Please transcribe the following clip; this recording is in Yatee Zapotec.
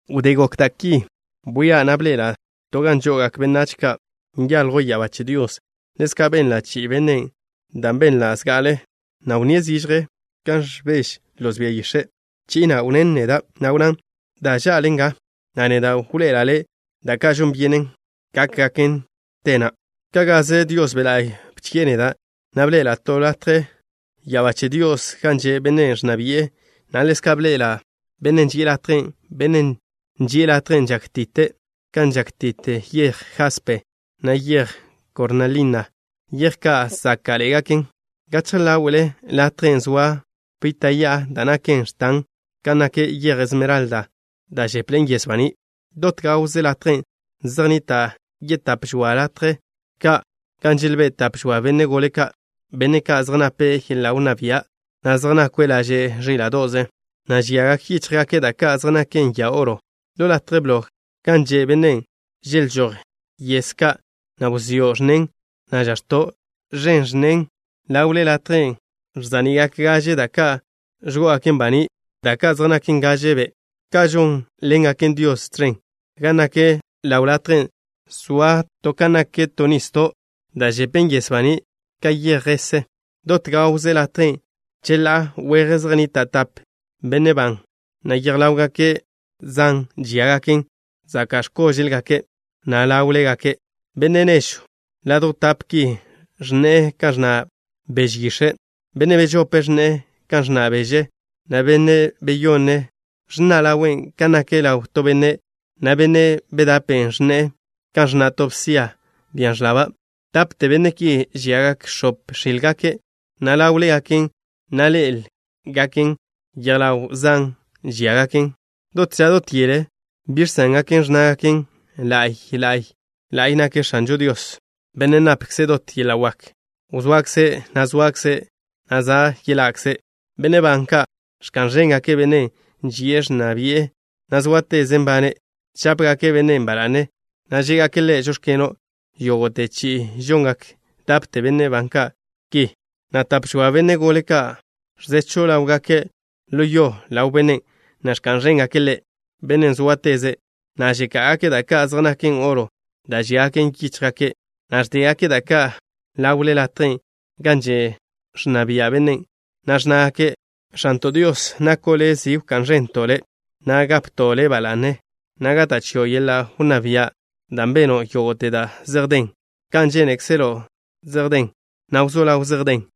Wdé gokgak da' ki, bwia' na' bḻe'ela' to gan žo'ogak benách da' nyaljwn ya'abá che Dios. Ḻezka' benla' chi'i bennen' dan' benla' zga'ale, na' wnníe' zižje kan ẕbež loz bia yix̱e'. Chi'i na' wnnén neda', na' wnnán: “Da ža'le nga, na' neda' wḻoe'ela' le' da' ka' žon byenen gákgaken te na'a.” Ka' gaze Dios Be' La'y bchi'e neda', na' bḻe'ela' to latje ya'abá che Dios gan že' Bennen' ẕnna bi'e, na' ḻezka' bḻe'ela' Bennen' ži'e latjen'. Bennen' ži'e latjen' žákti'te', kan žákti'te yej jaspe, na' yej kornalina, yej ka' záka'ḻe'egaken. Gachje ḻáwe'le latjen' zoa pita' ya'a da' naken x̱tan kan nak yej esmeralda, da' žepḻe'en yes baní'. Dot gawze latjen' zej nnita' yetáp žoa latje ka' gan želbé' tap žoa benne' gole ka', benne' ka' zej nape' yeḻa' wnná bia', na' zej nakwe' laže' ẕíla'do'ze, na' žiagak yíchjgake' da' ka' zej naken ya oro. Ḻo latje blo gan že' Bennen', želžój yes ka', na' wzió' ẕnnen, na' žax̱to' ẕen ẕnnen. Ḻawle latjen' ẕza'ni'gak gaže da' ka' ẕgó'ogaken baní', da' ka' zej naken gaže be' ka' žónḻengaken Dios tẕen. Gan nak ḻaw latjen' zoa to kan nak to nisdo' da' žepen yes baní' ka yej jese. Dot gawze latjen', cheḻá'a weje zej nnita' tape benne' ban, na' yej ḻáwgake' zan žíagaken zaka' x̱kóže'lgake', na' ḻáwlegake'. Benne' nežw ladjw tape' ki ẕnne'e kan ẕnna' beže yix̱e'. Benne' bežopen' ẕnne'e kan ẕnna' beže, na' benne' beyonnen' ẕnna' ḻawe' kan nak ḻaw to benne', na' benne' bedapen' ẕnne'e kan ẕnna' to bsia, bia ẕlaba'. Dapte benne' ki, žiagak x̱ope x̱ílgake', na' ḻáwlegaken, na' ḻé'elgaken, yej ḻaw zan žíagaken. Dot ža dot yele, bi žsángake' ẕnnágake': ¡La'y, la'y, la'y nak X̱anžo Dios, Bennen' napkze' dot yeḻa' wak! ¡Wzoakze', na' zoakze', na' za' yeḻa'kze'! Benne' ban ka' ẕka'n ẕéngake' Bennen' ži'e ẕnna bi'e, na' zóateze' nbane'. Žápegake' Bennen' ba la'ne, na' žé'gake' Ḻe': “Žóx̱keno'.” Yógo'te chi'i žongak dapte benne' ban ka' ki, na' tap žoa benne' gole ka' ẕzechw ḻáwgake' ḻo yo ḻaw Bennen', na' ẕka'n ẕéngake' Ḻe', Bennen' zóateze', na' žeká'gake' da' ka' zej naken oro da' žíagaken yíchjgake', na' ẕdégake' da' ka' ḻawle latjen' gan že' ẕnna bia' Bennen', na' ẕnnágake': ¡X̱anto' Dios, nako' Le' zi wká'n ẕento' Le', na' gapto' Le' ba la'ne, na' gata' chio' yeḻa' wnná bia' dan' beno' yógo'te da' zej den! Kan žénekzelo' zej den, na' wzó ḻaw zej den.